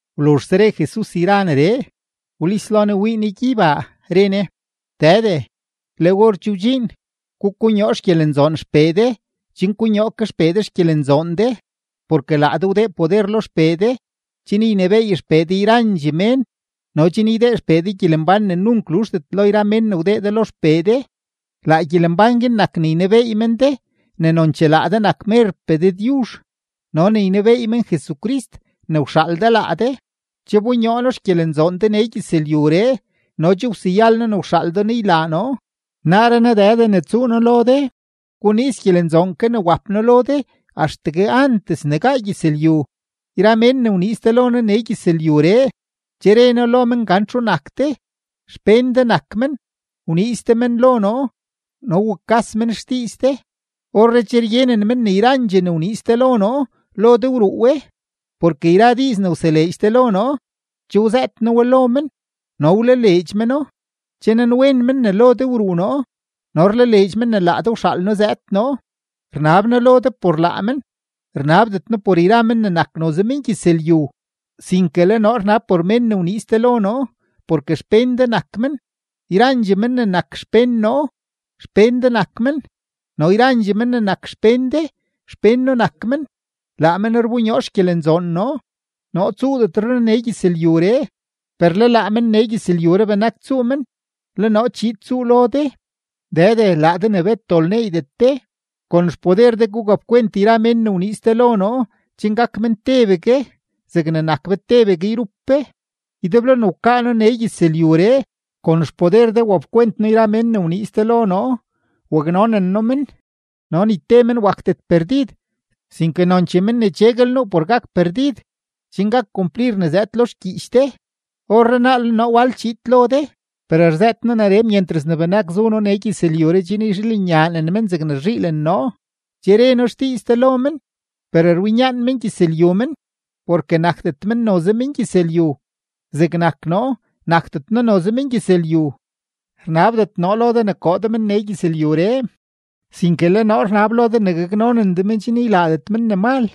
Wluzhse re Jesus yra neree, wlis lo Ne wii Ne gyeybaa, re Ne: ―Dëde, le or che wdxiin. Gukonyoo xgyelenzoon XPee de chen konyoo ke XPee de xgyelenzoon de. Porke laa de wdee poder lo XPee de chen ynebééy XPee de yrandxee mén no chen ydee XPee de gyelembán ne nunk luzhdet lo yra mén ne wdee de lo XPee de. Laa gyelembán guin nak ne ynebeey men de ne nonchee laa de nak merpee Dëdyuzh no ne ynebeey men Jesucrist ne wxaal de laa de. ’Che wbonyoo noo xgyelenzoon de nee gyëzlyuree no che wseyal noo ne wxaal de noo ylaa noo. Naaree naa Dëde ne tsuu noo lo de, guniiz gyelenzoon ke ne wap noo lo de axtegue antes ne gaa gyëzlyu. ’Yra mén ne wniiz de lo noo nee gyëzlyuree, che re noo lo men gan txu nak de. Xpén de nak men, wniiz de men lo noo no wukas men xdiiz de. Orree che ryenen men ne yrandxee ne wniiz de lo noo, lo de wruu we, porke yra diiz ne wseleedx de lo noo, che wzëët noo we lo men no wlaleedx meno. Che nanwen men ne lo de wruu noo, no rlaleedx men ne laa de wxaal noo zëëd noo. ’Rnab noo lo de por laa men; rnabdet noo por yra men ne nak noze mengyëzlyu, sinke le noo rnab por mén ne wniiz de lo noo, porke xpén de nak men. Yrandxee men ne nak xpén noo, xpén de nak men, no yrandxee men ne nak xpén de, xpén noo nak men; laa men rbonyoo xgyelenzoon noo. ’Noo tsuudetre noo nee gyëzlyuree, per le laa men nee gyëzlyuree benak tsuu men, le noo chiid tsuu lo de. Dëde laa de ne bet dol neeydet de, kon xpoder de gugapkwent yra mén ne wniiz de lo noo chen gak men tebegue zegne nak be tebegue yrup be. Ydeblo ne wkaa noo nee gyëzlyuree, kon xpoder de wapkwent noo yra mén ne wniiz de lo noo, waknonen noo men; no ni te men wakdet perdid, sinke nonchee men ne cheguel nuu por gak perdid, chen gak kumplir ne zëëd lo xgyiich de. ’Orrenaa le noo wal chiid lo de; per rzëët noo neree myentras ne benak zu noo nee gyëzlyuree chen yzhiilenyaanen men zegne rzhiilen noo. Che re noo xdiiz de lo men, per rwinyaan mengyëzlyu men porke nakdet men noze mengyëzlyu, zegnak noo, nakdet noo mengyëzlyu. Rnabdet noo lo de ne koo de men nee gyëzlyuree, sinke le noo rnab lo de ne gaknonen de men chen ylaadet men ne mal.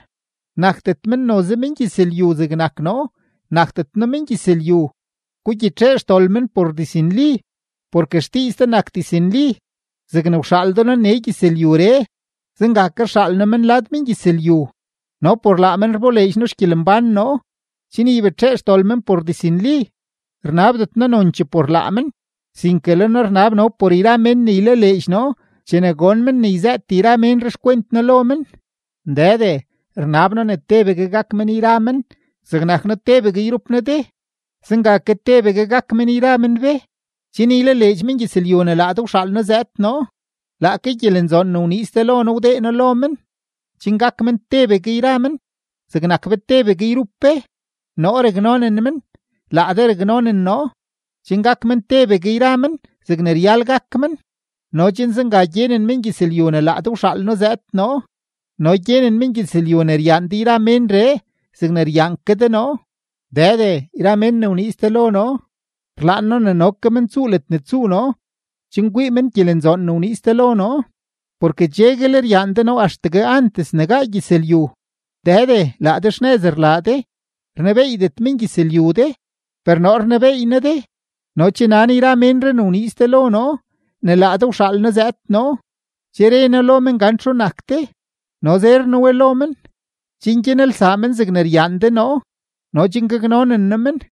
Nakdet men noze mengyëzlyu, zegnak noo, nakdet noo mengyëzlyu. Gugyitxee xdol men por diznli, porke xdiiz de nak diznli. Zegne wxaal de noo nee gyëzlyuree, zenga ke rxaal noo men lad mengyëzlyu. No por laa men rboleedx noo xgyelembán noo, chen ybetxee xdol men por diznli. ’Rnabdet noo nonchee por laa men, sinke le noo rnab no por yra mén ne ylaleedx noo chene gon men ne yzëët yra ménree xkwent noo lo men. Dëde, rnab noo ne tebegue gak men yra men, zegnak noo tebegue yrup noo de, zenga ke tebegue gak men yra men be, chen ylaleedx mengyëzlyu ne laa de wxaal noo zëëd noo. Laake gyelenzoon ne wniiz de lo noo wdee noo lo men, chen gak men tebegue yra men zegnak be tebegue yrup be. Noo raknonen men, laa de raknonen noo, chen gak men tebegue yra men zegne ryal gak men, no chen zenga gyenen mengyëzlyu ne laa de wxaal noo zëëd noo no gyenen mengyëzlyu ne ryaan de yra menree zegne ryaan ke de noo. ’Dëde, yra mén ne wniiz de lo noo, rlaan noo ne no ke men tsuu ledne tsuu noo chen kwii men gyelenzoon ne wniiz de lo noo, porke cheguel ryaan de noo axtegue antes ne gaa gyëzlyu. Dëde, laa de xnëz rlaa de. Rnebeeydet mengyëzlyu de, per noo rnebeey noo de; no che nan yra ménree ne wniiz de lo noo ne laa de wxaal noo zëëd noo. Che re noo lo men gan txu nak de, no zer noo we lo men, chen gyanelsaa men zegne ryaan de noo no chen gaknonen noo men.